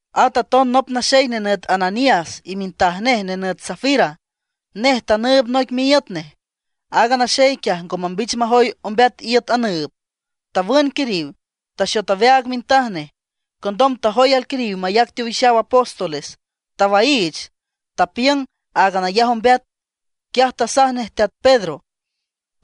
At aton nop naxey nenüt Ananías y mintaj nej nenüt Safira, nej tanüüb noic miíüt nej. Aaga naxey quiaj ngo mambich majoy ombeat iüt anüüb, tawün quiriw, taxot aweaag mintaj nej. Condom tajoy alquiriw mayac teowixaw apóstoles. Tawaiich, tapiüng áagan ayaj ombeat. Quiaj tasaj nej teat Pedro: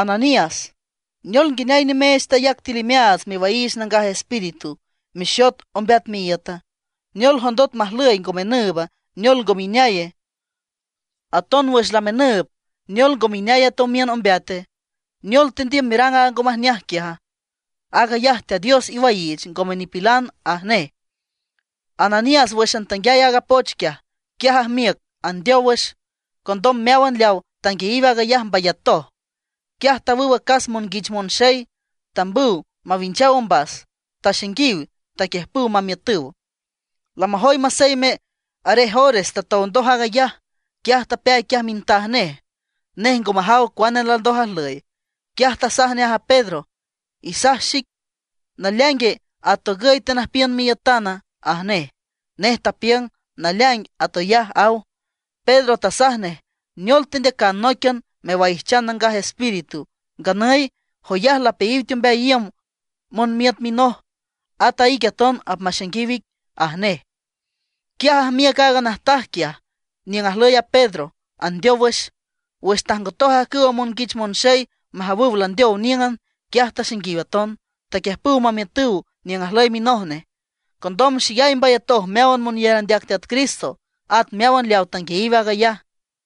―Ananías ¿neol nguineay nimeech tayac tiül imeaats mewaiich Nangaj Espíritu, mexot ombeat miíüta? ¿Neol jondot majlüy ngo menüüba, neol ngome ineaye? Aton wüx lamenüüb, ¿neol ngome ineay a tomiün ombeate? ¿Neol tendiüm merang aaga ngo majneaj quiaja? Aag ayaj Teat Dios iwaiich, ngome nipilan ―aj nej. Ananías wǘxan tanguiay aaga poch quiaj, quiaj ajmiüc andeow wüx. Condom meáwan leawa tanguiayiw aag ayaj mbayatoj. Quiaj tawüw acas monguich monxey, tambüw mawinchaw ombas, taxainguiw, taquiüjpüw mamiütüw. Lamajoy maseyme arej ores tatow ndoj aag ayaj, quiaj tapeay quiaj mintaj nej. Nej ngo majaw cuane landoj ajlüy. Quiaj tasaj nej a Pedro: ―Isaj xic ¿naleaingue, atogüy tenüjpiün miiütana? ―aj nej. Nej tapiüng: ―Naleaing atoyaj ―aw. Pedro tasaj nej: ―¿Neol tendeacan nóiquian mewaijchan Nangaj Espíritu? Nganüy, joyaj lapeayiw teombeay iüm monmiüt minoj. At a ique aton apmaxainguiw ic ―aj nej. Quiaj ajmiüc aaga najtaj quiaj niüng ajlüy a Pedro, andeow wüx. Wüx tajngotoj ajcüwa monguich monxey majawüw landeow níüngan, quiaj taxainguiw aton, taquiüjpüw mamiütüw niüng ajlüy minoj nej. Condom xeyay mbayatoj meáwan monyar andeac Teat Cristo, at meáwan leaw tanguiayiw aag ayaj.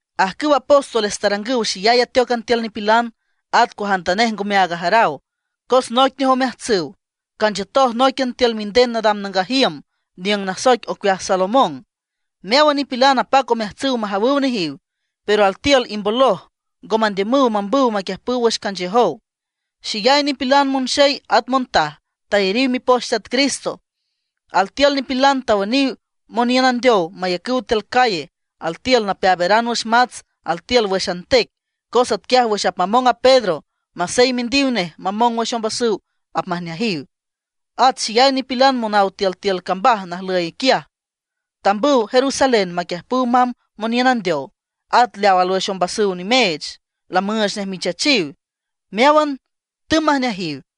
Ajcüw apóstoles tarangüw xeyay ateócan tiül nipilan, at cuajantanej ngome aag ajaraw. Cos noic nej omeajtsüw, canchiütoj nóiquian tiül minden nadam nangaj iüm, niüng nasoic ocueaj Salomón. Meáwan nipilan apac omeajtsüw majawüw nejiw, pero altiül imboloj, ngo mandiümüw mambüw maquiüjpüw wüx canchiüjow. Xeyay nipilan, monxey at montaj, tayariw mipoch Teat Cristo. Altiül nipilan tawüniw moniün andeow mayacüw tiül calle; altiül napeaaberan wüx mats, altiül wǘxan tec, cos atquiaj wüx apmamong a Pedro, masey mindiw nej mamong wüx ombasüw apmajneajiw. At xeyay nipilan monaw tiültiül cambaj najlǘyan quiaj, tambüw Jerusalén maquiüjpüw mamb moniün andeow, at leaw alwüx ombasüw nimeech, lamüüch nej michachiw. Meáwan tümb majneajiw.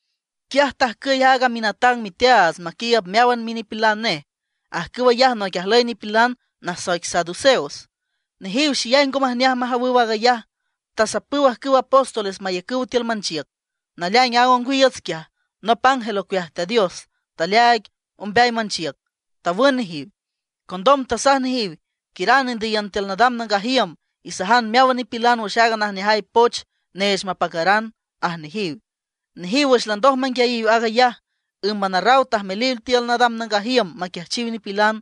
Quiaj tajcüy aaga minatang miteaats maquiiüb meáwan minipilan nej. Ajcüw ayaj noic ajlüy nipilan nasoic saduceos. Nejiw xeyay ngo majneaj majawüw aag ayaj. Tasapüw ajcüw apóstoles mayacüw tiül manchiüc. Naleaing aaga ongwiiüts quiaj, nop ángel ocueaj Teat Dios taleaaig ombeay manchiüc, tawün nejiw. Condom tasaj nejiw: ―Quiüran indüyiün tiül nadam nangaj iüm, isajan meáwan nipilan wüx aaga najneajay poch neech mapacaran ―aj nejiw. Nejiw wüx landoj manguiayiw aag ayaj, ǘmban arraw tajmeliw tiül nadam nangaj iüm maquiajchiw nipilan.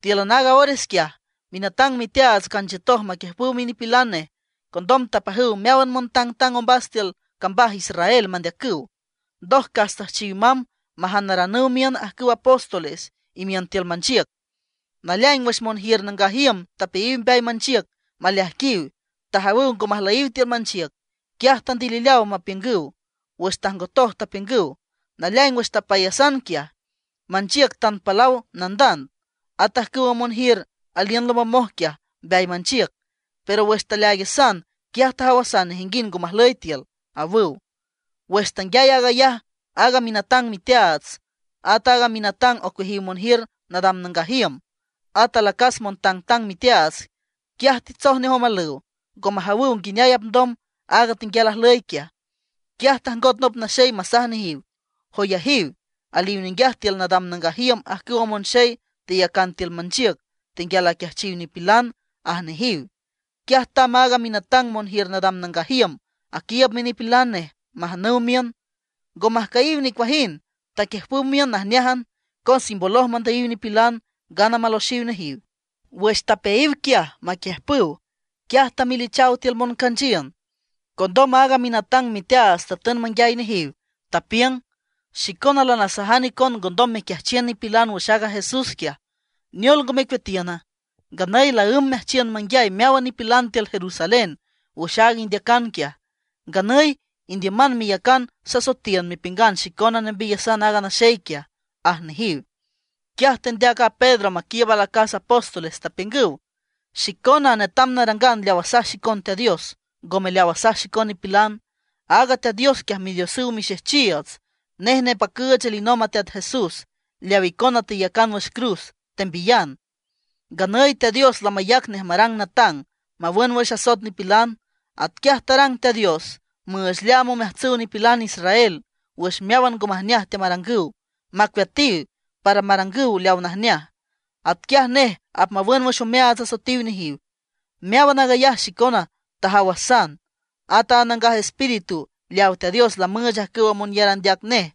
Tíülan aaga ores quiaj minatang miteaats canchiütoj maquiiüb minipilan nej. Condom tapajüw meáwan montangtang ombas tiül cambaj Israel mandeacüw. Ndoj cas tüjchiw mamb majanaranüw miün ajcüwa apóstoles imiün tiül manchiüc. Naleaing wüx monjiür nangaj iüm tapeayiw mbeay manchiüc maleaijquiw, tajawüw ngo majlüyiw tiül manchiüc. Quiaj tandilileaw mapiüngüw. Wüx tajngotoj tapiüngüw: ―Naleaing wüx tapeayasan quiaj, manchiüc tan palaw nandand; at ajcüwa monjiür aliün lombomoj quiaj mbeay manchiüc. Pero wüx taleaaigasan, quiaj tajawasan nejinguind ngo majlüy tiül ―awüw. Wüx tanguiay aag ayaj aaga minatang miteaats, at a minatang ocueajiw monjiür nadam nangaj iüm, at alacas montangtang miteaats, quiaj titsoj nej omalüw, ngo majawüw nguineay apndom aaga tenguial ajlüy quiaj. Quiaj tajngot nop naxey masaj nejiw: ―Joyajiw, aliw ninguiaj tiül nadam nangaj iüm ajcüwa monxey teyacan tiül manchiüc, tenguial aquiajchiw nipilan ―aj nejiw. Quiaj tamb a minatang monjiür nadam nangaj iüm, aquiiüb minipilan nej majanüw miün. Ngo majcüyiw nicuajind, taquiüjpüw miün najneájan, cos imboloj mandüyiw nipilan, ngana maloxiw nejiw. Wüx tapeayiw quiaj maquiüjpüw, quiaj tamelichaw tiül moncanchiün. Condom aaga minatang miteaats tatün manguiay nejiw, tapiüng: ―Xicona lanasajan icon ngondom mequiajchiün nipilan wüx aaga Jesús quiaj. ¿Neol ngo mecueatiüna? Nganüy laǘmb meajchiün manguiay meáwan nipilan tiül Jerusalén wüx aaga indeacan quiaj. Nganüy indiüman meyacan sasoetiün mepiüngan xicona nembiyasan aaga naxey quiaj ―aj nejiw. Quiaj tendeac a Pedro maquiiüb alacas apóstoles, tapiüngüw: ―Xicona netam narangan leaw asaj xicon Teat Dios, ngome leaw asaj xicon nipilan. Aaga Teat Dios quiaj Midiosüw mixejchiiüts, nej nepacüüch alinomb a Teat Jesús, leaw icona teyacan wüx cruz, tembiyan. Nganüy Teat Dios lamayac nej marang natang, mawün wüx asoet nipilan. Atquiaj tarang Teat Dios müüch leaam omeajtsüw nipilan israel wüx meáwan ngo majneaj teamarangüw, macueatiw, para marangüw leaw najneaj. Atquiaj nej apmawün wüx omeaats asoetiw nejiw. Meáwan aag ayaj xicona tajawasan. At a Nangaj Espíritu leaw Teat Dios lamüüch ajcüw monyar andeac nej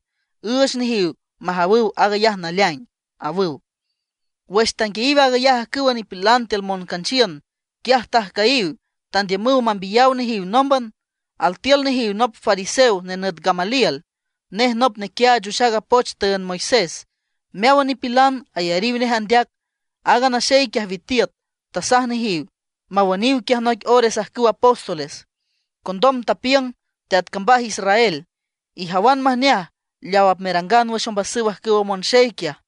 üüch nejiw majawüw aag ayaj naleaing ―awüw. Wüx tanguiayiw aag ayaj ajcüwa nipilan tiül moncanchiün, quiaj tajcüyiw, tandiümüw mambiyaw nejiw nómban. Altiül nejiw nop fariseo nenüt Gamaliel. Nej nop nequiaach wüx aaga poch tüünd Moisés. Meáwan nipilan ayariw nej andeac. Aaga naxey quiaj witiüt, tasaj nejiw mawüniw quiaj noic ores ajcüw apóstoles. Condom tapiüng: ―Teat cambaj Israel, ijawan majneaj leaw apmerangan wüx ombasüw ajcüwa monxey quiaj.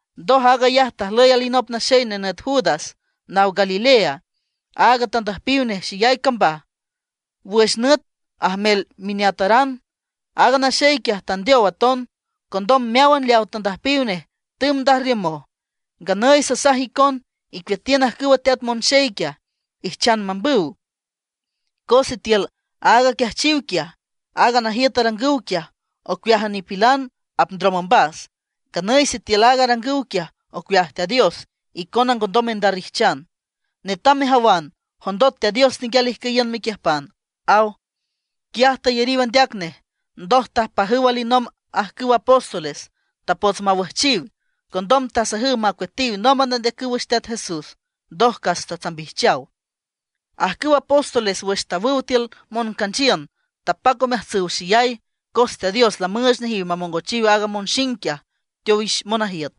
Ndoj aag ayaj tajlüy alinop naxey nenüt Judas naw Galilea. At tandüjpiw nej xeyay cambaj wüx nüt ajmel mineataran. Aaga naxey quiaj tandeow aton. Condom meáwan leaw tandüjpiw nej tümb ndajrriümoj. Nganüy sasaj icon, icueatiün ajcüwa teat monxey quiaj, ijchan mambüw. Cos sitiül aaga aquiajchiw quiaj, aaga najiüt arangüw quiaj, ocueájan nipilan apndrom ombas. Nganüy sitiül aaga arangüw quiaj ocueaj Teat Dios, icona ngondom mendarrijchan. Netam mejawan, jondot Teat Dios tenguial ijcüyiün mequiüjpan ―aw. Quiaj tayariw andeac nej. Ndoj tapajüw alinomb ajcüwa apóstoles, tapots mawüjchiw. Condom tasajüw macueatiw nómban andeacüw wüx Teat Jesús. Ndoj cas tatsambijchaw. Ajcüwa apóstoles wüx tawüw tiül moncanchiün, tapac omeajtsüw xeyay, cos Teat Dios lamüüch nejiw mamongochiw aaga monxing quiaj teowix monajiüt,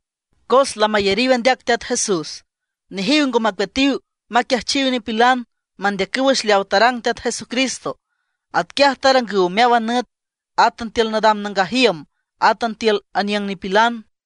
cos lamayariw andeac Teat Jesús. Nejiw ngo macueatiw maquiajchiw nipilan, mandeacüw wüx leaw tarang Teat Jesucristo. Atquiaj tarangüw meáwan nüt, átan tiül nadam nangaj iüm, átan tiül aniüng nipilan.